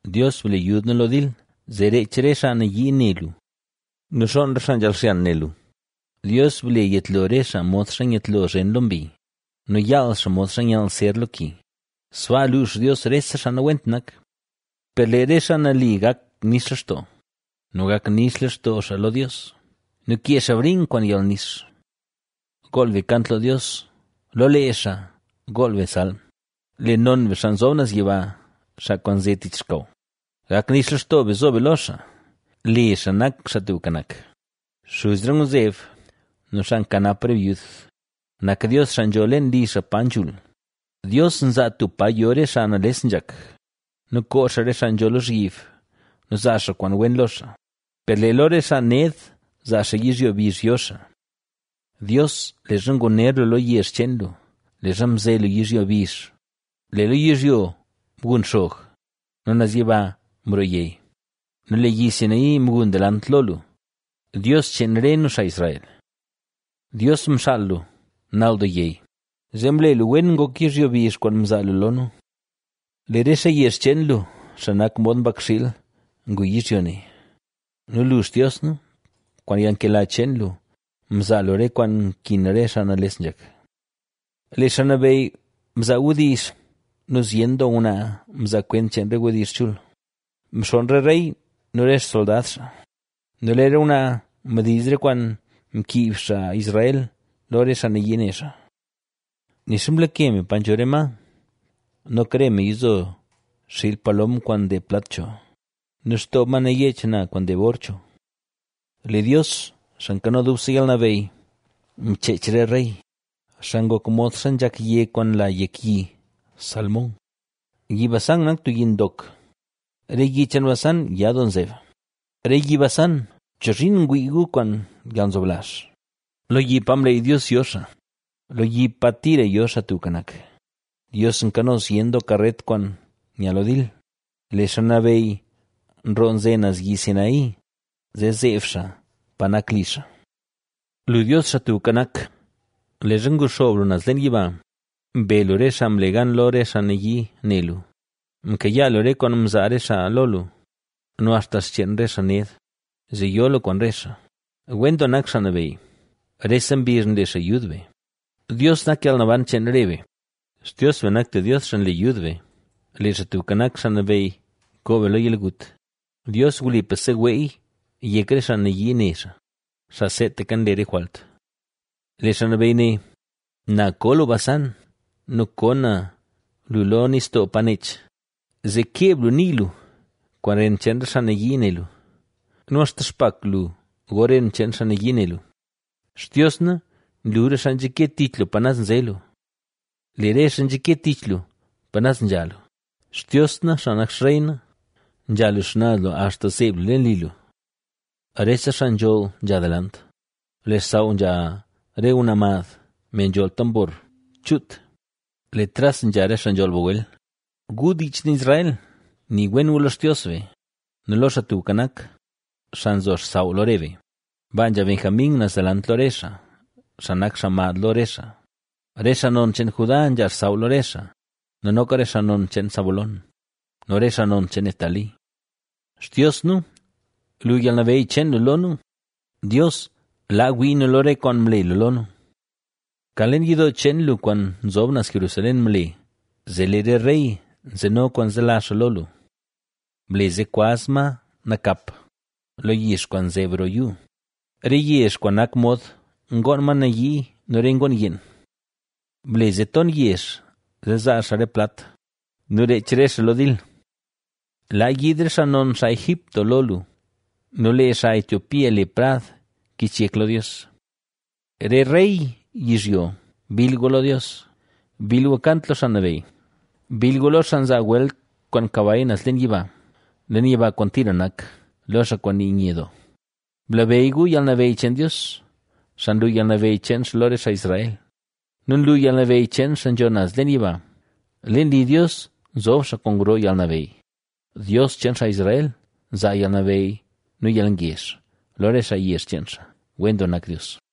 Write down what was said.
Dios, ble yud nu lo dil, zee reech re xaa nayii ne lu nu xoon re xaa nzhaal xyan ne lu. Dios, ble yetlo re xaa modxa nyetlo zhen lo mbi nu yaal xaa modxa nyall ser lo ki, sbaa luux Dios re xaa nawent nak. Per lee re xaa nali gak nix lextoo nu gak nix lextoo xaa lo Dios nu kee xaa briink kwaan yalnix. ¡Gool be kant lo Dios lo lee xaa gool be salm! Le non be Xaa Nzob Naz Yiba xaa kwaan nze tich xkaw. ¡Gak nix lextoo be zo be lo xaa; le xaa nak Xaa Tubka Nak! Xuz re ngwzeb nu xaa nkanap re byud, nak Dios xaa nzho leen li xaa pa nzhul. Dios nzaa tub pa yo re xaa nales nzhak, nu koo xaa re xaa nzho lozhyib nu nzaa xaa kwaan wen lo xaa, per lee lo re xaa ned zaa xaa yizhyo bizh yo xaa. Dios, leezha nguner lu lo yezh cheen lu, leezha mze lu yizhyo bizh, lee lo yizhyo mgun xog nu naz yiba mroo yey nu lee Yi Sinaí mgun delant lo lu, Dios cheen re nu xaa Israel. Dios, mxaal lu nal doo yey; zee mle lu wen ngok yizhyo bizh kwaan mzaa lu lo nu. Lee re xaa yezh cheen lu, xaa nak mod mbakxiil, ngu yizhyo ne nu lu, Xtios na, kwaan yalnkela cheen lu, mzaa lu re kwaan nkin re xaa nales nzhak. Lee Xaa Nabeyy mzaa wdizh nu zyen doo ngwnaa mzaa kwent cheen re wdizh chul: Mxonn re rey nu re xsoldad xaa nu lee re ngwnaa mdiiz re kwaan mkiib xaa Israel lo re xaa nayii ne xaa. Nixa mlake me pa nzho re ma, noka re me yizo xiil palom kwaan ndeeb plat cho nu xtoob ma nayech na kwaan ndeeb or cho. Lee Dios, Xaa Nkano Dubse Yalnabeyy, mcheech re rey, xaa ngok modxa nzhak yeg kwaan nla yek yi Salmón. Yi Basán nak tub yi ndok; re yi cheen Basán ya doo nzeb. Re Yi Basán, ¿chozhiin ngwii gu kwaan yalnzoblazh, lo yi pa mleey Dios yo xaa, lo yi pa tira yo Xaa Tubka Nak? Dios nkano zyen doo karet kwaan nya lo dil, lee Xaa Nabeyy mroo nze naz Yi Sinaí, zee zeeb xaa pa nak li xaa. Lu, Dios, Xaa Tubka Nak, leezha nguxoob lu naz leen yiba, mbe lu re xaa mle lu gan lo re xaa nayii ne lu; mkayaa lu re kwaan mzaa re xaa lo lu nu axta cheen re xaa ned, zee yo lu kwaan re xaa. ¡Wen doo nak Xaa Nabeyy! ¡Rese mbizh nle xaa yud be, Dios, nak yalnaban cheen re be! Xtios be nak tub Dios xaa nle yud be; lee Xaa Tubka Nak, Xaa Nabeyy, koo be lo yalgut. Dios wlipa seweey yek re xaa nayii ne xaa, xaa seetaka nle re jwalt. Lee Xaa Nabeyy né: “Na ko lu Basán nu ko na lu lo nistoo pa nech, Zee keeb lu nii lu kwaan ren cheen re xaa nayii ne lu nu axta xpak lu go ren cheen xaa nayii ne lu.” Xtios na, nlu re xaa nzhake tich lu pa naz nze lu. Lee re xaa nzhake tich lu pa naz nzha lu, Xtios na xaa nak Xrey na, nzha lu xnaz lu axta zeeb lu leen li lu. Re xaa nzholl nzha delant, lee xsaw nzha re ngwnaa mad, me nzholl tambor chuut, lee tras nzha re xaa nzholl bagwel. ¡Gu, dii cheen Israel, nii wen gu lo Xtios be nu lo Xaa Tubka Nak, xaa nzo xsaw lo re be! Baa nzha Benjamín naz delant lo re xaa, xaa nak xaa mad lo re xaa, re xaa non cheen Judá nzha xsaw lo re xaa nu noka re xaa non cheen Zabulón, nu re xaa non cheen Neftalí. Xtios nu, lu yalnabeyy cheen lu lo nu; Dios laa wii nu lo re kwaan mle lu lo nu. Kan leen yidoo cheen lu kwaan nzob naz Jerusalén mle, zee lee re rey nzeno kwaan zelazh xaa lo lu. Ble zee kwaz ma nakap, lo yix kwaan nzeb roo yuu, re yezh kwaan nak mod ngoon ma nayii nu re ngoon yeen. Ble zee ton yezh zee zaa xaa re plat nu reech re xaa lo dil. Laa yiid re xaa non xaa Egipto lo lu nu lee xaa Etiopía le prad kich yek lo Dios. Re rey yizhyo, ¡bill gu lo Dios! ¡bill gu kant lo Xaa Nabeyy! Bill lo xaa nzaa welt kwaan kabay naz leen yiba, leen yiba kwaan tira nak, lo xaa kwaan nii nye doo. Blabeyy gu yalnabeyy cheen Dios, xaa nlu yalnabeyy cheen xaa lo re xaa Israel nu nlu yalnabeyy cheen xaa nzho naz leen yiba. Leen li Dios nzob xaa kwaan gro yalnabeyy; Dios cheen xaa Israel nzaa yalnabeyy nu yalngezh, lo re xaa yezh cheen xaa. ¡Wen doo nak Dios!